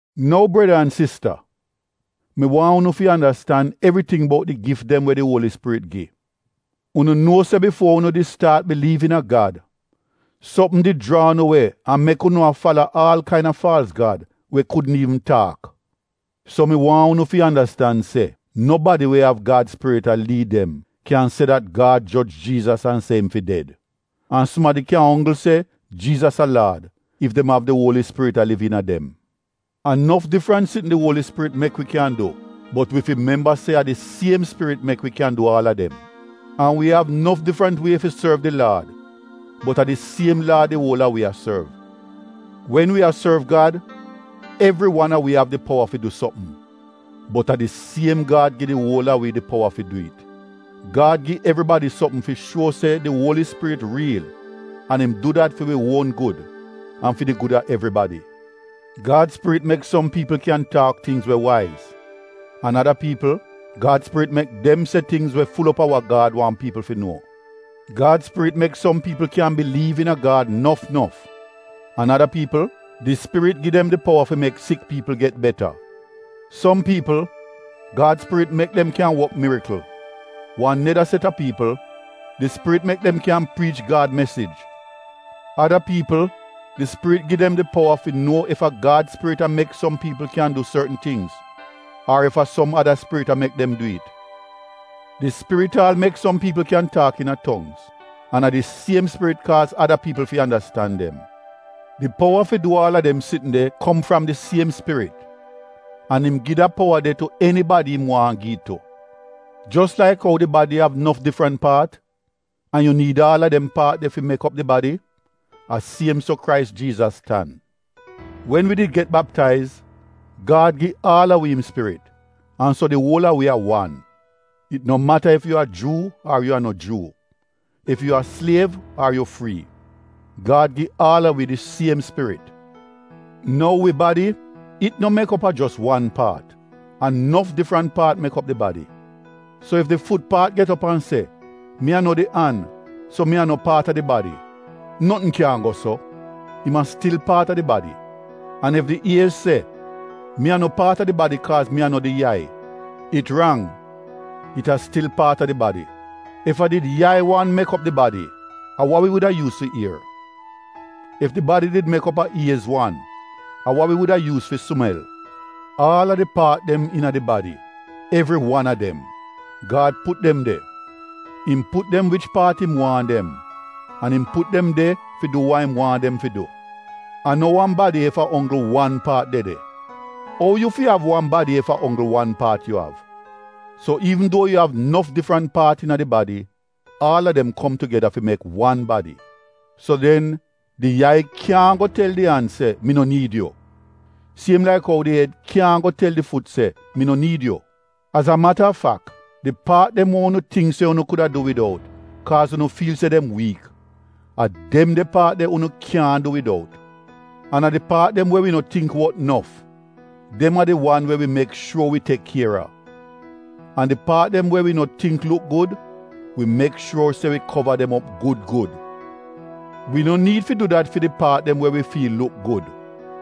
Nou breda an sista, mi waahn unu fi andastan evriting bout di gif dem we di Uoli Spirit gi. Unu nuo se bifuo unu di staat biliiv iina Gad, sopm did jraa unu we an mek unu a fala aal kaina faalz gad we kudn iivn taak. So mi waahn unu fi andastan se nobadi we av Gad spirit a liid dem kyan se dat, “Gad joj Jiizas an se im fi ded.” An sumadi kyan onggl se, “Jiizas a Laad” ef dem av di Uoli Spirit a liv iina dem. A nof difrant sitn di Uoli Spirit mek wi kyan du bot wi fi memba se a di siem Spirit mek wi kyan du aal a dem. An wi av nof difrant wie fi sorv di Laad bot a di siem Laad di uol a wi a sorv. Wen wi a sorv Gad evri wan a wi av di powa fi du sopm bot a di siem Gad gi di uol a wi di powa fi du it. Gad gi evribadi sopm fi shuo se di Uoli Spirit riil an im du dat fi wi uon gud an fi di gud a evribadi. Gad spirit mek som piipl kyan taak tingz we waiz an ada piipl, Gad spirit mek dem se tingz we ful op a wa Gad waahn piipl fi nuo. Gad Spirit mek som piipl kyan biliiv iina Gad nof nof an ada piipl, di Spirit gi dem di powa fi mek sik piipl beta. Som piipl, Gad Spirit mek dem kyan wok mirikl. Wan neda set a piipl, di Spirit mek dem kyan priich Gad mesij. Ada piipl di Spirit gi dem di powa fi nuo ef a Gad spirit a mek som piipl kyan du sortn tingz ar ef a som ada spirit a mek dem du it. Di Spirit aal mek som piipl kyan taak iina tongz an a di siem Spirit kaaz ada piipl fi andastan dem. Di powa fi du aal a dem sitn de kom fram di siem Spirit an im gi da powa de tu enibadi im waahn gi it tu. Jos laik ou di badi av nof difrant paat, an yu niid aal a dem paat de fi mek op di badi, a siem so Krais Jiizas tan. Wen wi did get baptaiz, Gad gi aal a wi im Spirit an so di uol a wi a wan. It no mata ef yu a Juu ar yu a no Juu, ef yu a sliev ar yu frii, Gad gi aal a wi di siem Spirit. Nou wi badi, it no mek op a jos wan paat. A nof difrant paat mek op di badi. So ef di fut paat get op an se, “Mi a no di an so mi a no paat a di badi,” notn kyaahn go so, im a stil paat a di badi. An ef di iez se, “Mi a no paat a di badi kaaz mi a no di yai,” it rang, it a stil paat a di badi. Ef a did yai wan mek op di badi, a wa wi wuda yuuz fi ier? Ef di badi did mek op a iez wan, a wa wi wuda yuuz fi sumel? Aal a di paat dem iina di badi, evri wan a dem, Gad put dem de. Im put dem wich paat im waahn dem an im put dem de fi du wa im waahn dem fi du. A no wan badi ef a onggl wan paat de de. Ou yu fi av wan badi ef a onggl wan paat yu av? So iivn duo yu av nof difrant paat iina di badi, aal a dem kom tugeda fi mek wan badi. So den di yai kyaahn go tel di an se, “Mi no niid yu,” siem laik ou di ed kyaahn go tel di fut se, “Mi no niid yu.” Az a mata a fak, di paat dem we unu tingk se unu kuda du widout kaaz unu fiil se dem wiik, a dem de paat de unu kyaahn du widout. An a di paat dem we wi no tingk wot nof, dem a di wan we wi mek shuor wi tek kier a. An di paat dem we wi no tingk luk gud, wi mek shuor se wi kova dem op gud gud. Wi no niid fi du dat fi di paat dem we wi fiil luk gud.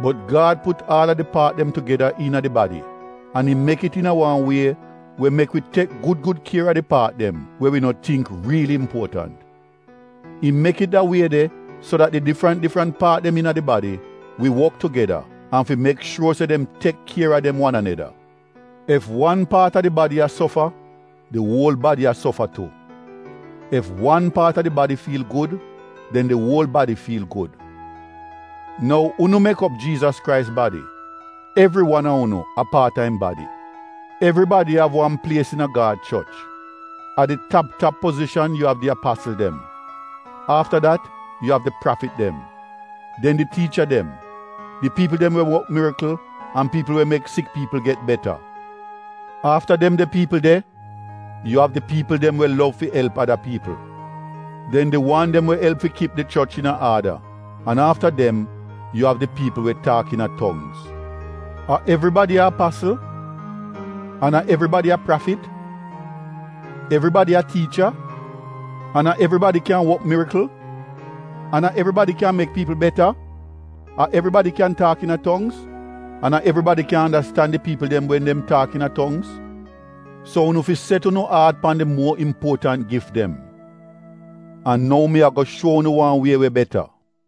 Bot Gad put aal a di paat dem tugeda iina di badi an im mek it iina wan wie we mek wi tek gud gud kier a di paat dem we wi no tingk riili impuotant. Im mek it da wie de so dat di difrant difrant paat dem iina di badi wi wok tugeda an fi mek shuor se dem tek kier a dem wan aneda. Ef wan paat a di badi a sofa, di uol badi a sofa tu. Ef wan paat a di badi fiil gud den di uol badi fiil gud. Nou unu mek op Jiizas Krais badi, evri wan a unu a paat a im badi. Evribadi av wan plies iina Gad choch. A di tap tap pozishan yu av di apasl dem. Afta dat yu av di prafit dem, den di tiicha dem, di piipl dem we wok mirikl an piipl we mek sik piipl get beta. Afta dem de piipl de, yu av di piipl dem we lov fi elp ada piipl, den di wan dem we elp fi kip di choch iina aada an afta dem yu av di piipl we taak iina tongz. A evribadi a apasl? An a evribadi a prafit? Evribadi a tiicha? An a evribadi kyan wok mirikl? An a evribadi kyan mek piipl beta? A evribadi kyan taak iina tongz? An a evribadi kyan andastan di piipl dem wen dem taak iina tongz? So unu fi set unu aat pan di muor impuotant gif dem. An nou mi ago shuo unu wan wie we beta.